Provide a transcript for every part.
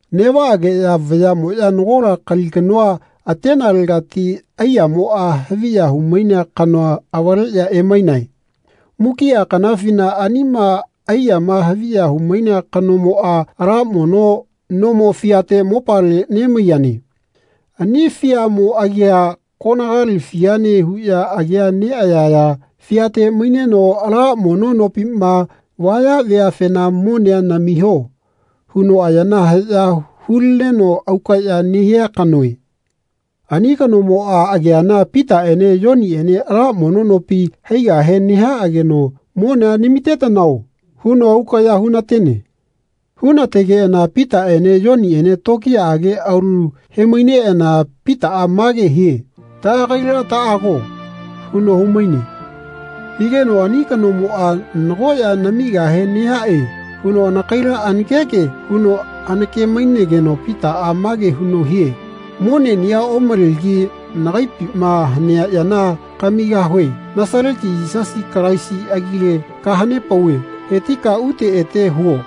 Neꞌvaꞌageꞌya vayaꞌmoꞌya nagola kali kanoa, atenelegati aiyamoꞌa haviya humainea kanoa, avaleꞌya emainae. Mukiꞌa kanafina anima aiyama haviya humainea kanomoꞌa ala mono nomo fiate mopale nemaiyane. Ani fiamo agia koganali fiane huꞌya agia neꞌayaya fiate maineno ala mono nopima vaya veafena “Monea namiho.” huno ayana haꞌya hulineno aukaꞌya nehia kanoe. Ani kanomoꞌa ageana Pitaꞌene Yoniꞌene ala mono nopi haigahe nehaꞌageno “Monea namitetanao.” huno aukaꞌya hunatene. Hunategeꞌana Pitaꞌene Yoniꞌene tokiyaꞌage aulu hemaineꞌana Pitaꞌa mage hie “Taꞌagaila taꞌago.” huno humaine. Higeno ani kanomoꞌa “Nago ya namigahe nehaꞌe.” huno anakaila anakeke huno anake-mainegeno Pitaꞌa mage huno hie “Moneꞌniꞌa omalegi nagaipima hanea yana kamigahue Nasaleti Yisasi Kalaisi agile kahanepauve hetika ute ete huo.”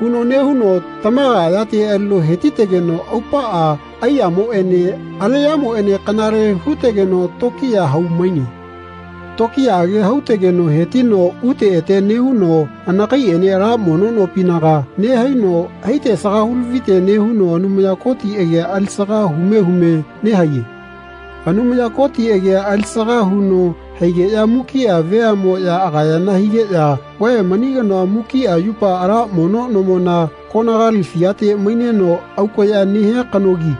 huno nehuno tamaga ayate alino hetitegeno aupaꞌa aiyamoꞌene aleꞌyamoꞌene kanale hutegeno tokiya hau-maine. Tokiyaꞌage hautegeno hetino ute ete nehuno anakaiꞌene ala mono nopinaga nehaino haite asaga hulavite nehuno Anumaya Koti agia alisaga hume hume nehaiye. Anumaya Koti agia alisaga huno haigeꞌya mukiꞌa veaꞌmoꞌya agayana higeꞌya “Vae mani kanoa mukiꞌa yupa ala mono nomona koganali fiate maineno aukaꞌya nehia kanogi.”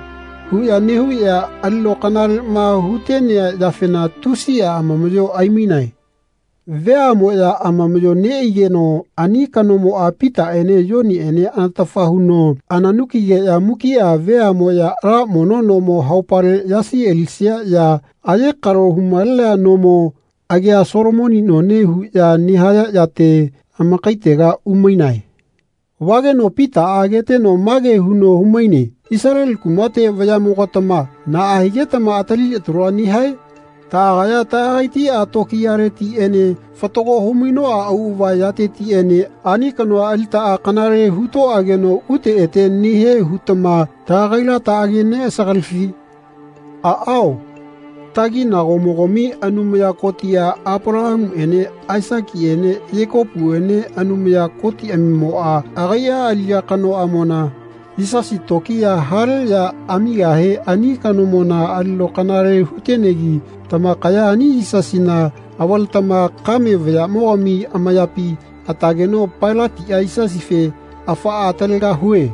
huꞌya nehuꞌya alino kanaleꞌma hutenea yafena tusiꞌa amamaꞌyo aimainae. Veaꞌmoꞌya amamaꞌyo neꞌaigeno ani kanomoꞌa Pitaꞌene Yoniꞌene anatafa huno ananukigeꞌya mukiꞌa veaꞌmoꞌya ala mono nomo haupale yasi alisia ya ayekalo humalenea nomo, agia Solomoni none huꞌya nehaya yate, amakaitega umainae. Vageno Pitaꞌa ageteno mage huno humaine “Isaleli kumate vayaꞌmogatama naꞌa higetama atali talua nehae? Taꞌagaya taꞌagaitiꞌa tokiyaletiꞌene fatago humainoꞌa auꞌava yatetiꞌene ani kanoa alitaꞌa kanale hutoꞌageno ute ete nehie hutama taꞌagaila taꞌageneꞌasagalifi? Aꞌao. Taginagomogami Anumaya Kotiꞌa, Apalahamuꞌene Aisakiꞌene Yekopuene Anumaya Kotiꞌamimoꞌa, agaiꞌa aliꞌya kanoꞌamona, Yisasi, tokiya hale ya amigahe ani kanomona alino kanale hutenegi tamakaya ani Yisasina avaletama kame vayaꞌmogami amayapi atageno Pailatiꞌa Yisasife ‘Afaꞌa atalegahue.’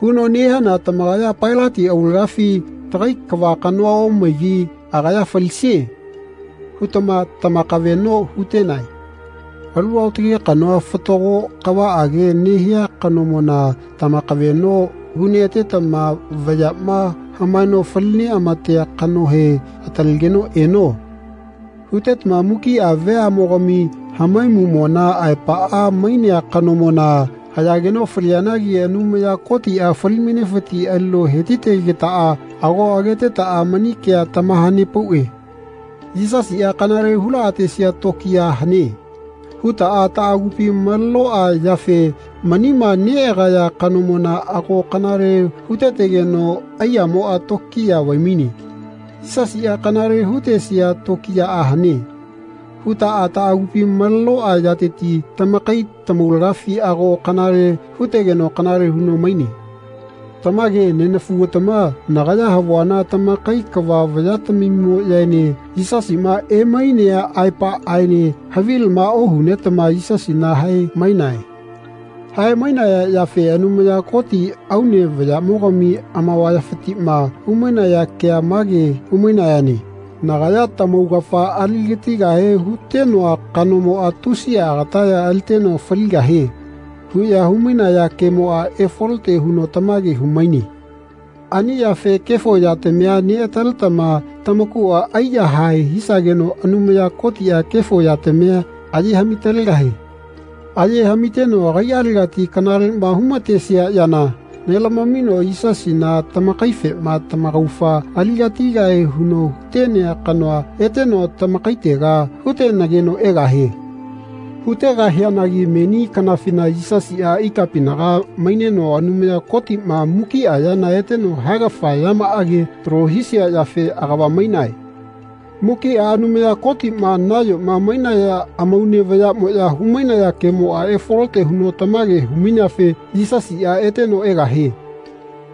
huno nehiana tamakaya Pailati aulagafi ‘Tagai kava kanoa omaigi agaya falisie.’ hutama tamakaveꞌno hutenae. Alu aotage kanoa fatago kavaꞌage nehia kanomona tamakaveꞌno huneꞌatetama vayaꞌma hamaeno fali neꞌamatea kanohe ‘Atalegeno eno.’ hutetama mukiꞌa veaꞌmogami hamaimuꞌmona aepaꞌa mainea kanomona hayageno falianagi Anumaya Kotiꞌa fali-mainefiti alino hetitegetaꞌa ago agetetaꞌa mani kea tamahanepauꞌe. ‘Yisasiꞌa kanale hulaꞌatesia tokiya hane.’ hutaꞌa taꞌagupi malenoꞌa yafe manima neꞌagaya kanomona ago kanale hutetegeno aiyamoꞌa tokiya vaimaine. ‘Yisasiꞌa kanale hutesia tokiyaꞌa hane.’ hutaꞌa taꞌagupi malenoꞌa yateti tamakai tamaulagafi ago kanale hutegeno kanale huno maine. Tamage nenafugatama nagaya havuana tamakai kava vayatamimoꞌyaene Yisasiꞌma emainea aepaꞌaene havilama ohunetama Yisasina hae-mainae. Hae-mainaya yafe Anumaya Koti aune vayamogami amavayafitiꞌma humainaya kea mage humainayane ‘Nagaya tamaugafa aligatigahe hutenoa kanomoꞌa tusiꞌa agataya aliteno faligahie.’ huꞌya humainaya kemoꞌa efalote huno tamage humaine. Ani yafe kefo yatamia neꞌataletama tamakuꞌa aiyahae hisageno Anumaya Kotiꞌa kefo yatamia aye haꞌmi-talegahie. Aye haꞌmiteno agaiꞌalegati kanaleꞌma humatesia yana nelamamino Yisasina tamakaifema tamaugafa aligatigahie huno hutenea kanoa eteno tamakaitega hutenageno egahie. Hutegahianagi meni kanafina Yisasiꞌa ikapinaga maineno Anumaya Kotiꞌma mukiꞌa yana eteno haegafa yamaꞌage talo hisia yafe agava-maine. Mukiꞌa Anumaya Kotiꞌma nayoma mainaya amaune vayaꞌmoꞌya humainaya kemoꞌa efalote huno tamage humaineafe Yisasiꞌa eteno egahie.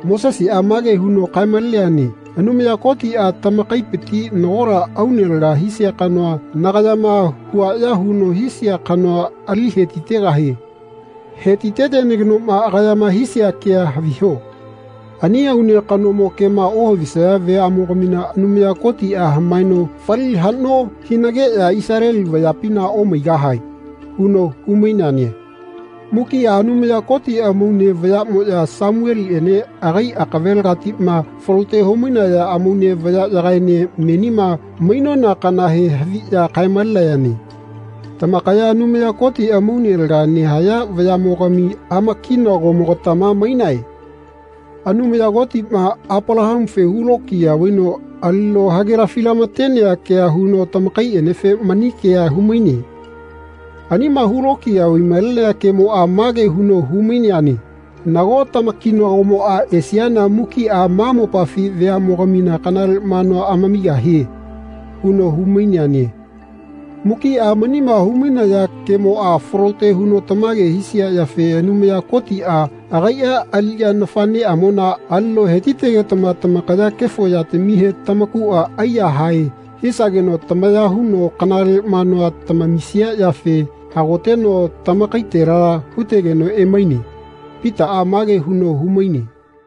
Moseseꞌa mage huno kaemaleneane ‘Anumaya Kotiꞌa tamakaipiti nagola aune laga hisia kanoa nagayama huaꞌya huno hisia kanoa ali hetitegahie. Hetitetenagenoꞌma agayama hisia kea haviho. Ani aune kanomo kema ohavisaya veaꞌmogamina Anumaya Kotiꞌa hamaeno fali haꞌno hinageꞌya Isaleli veapina omaigahae.’ huno humaineane. Mukiꞌa Anumaya Koti amaune vayaꞌmoꞌya Samueliꞌene agai akavelegatiꞌma falote humainaya amaune vayaꞌyagaene menima mainona kanahe haviꞌya kae-malenayane. Tamakaya Anumaya Koti amaune laga nehaya vayaꞌmogami amakinagomogatama mainae. Anumaya Kotiꞌma Apalahamufe hulokiya vaino alino hagelafi lamatenea kea huno tamakaiꞌenefe mani kea humaine. Anima hulokiya vaimalenea kemoꞌa mage huno humaineane ‘Nago tamakinagomoꞌa esiana mukiꞌa ma mopafi veaꞌmogamina kanale manua amamigahie.’ huno humaineane. Mukiꞌa manima humainaya kemoꞌa falote huno tamage hisia yafe Anumaya Kotiꞌa agaiꞌa aliꞌya nafaꞌneꞌamona alino hetitegetama tamakaya kefo yatamihe tamakuꞌa aiyahae hisageno tamaya huno kanale manua tamamisia yafe hagoteno tamakaitela hutegeno emaine.” Pitaꞌa mage huno humaine.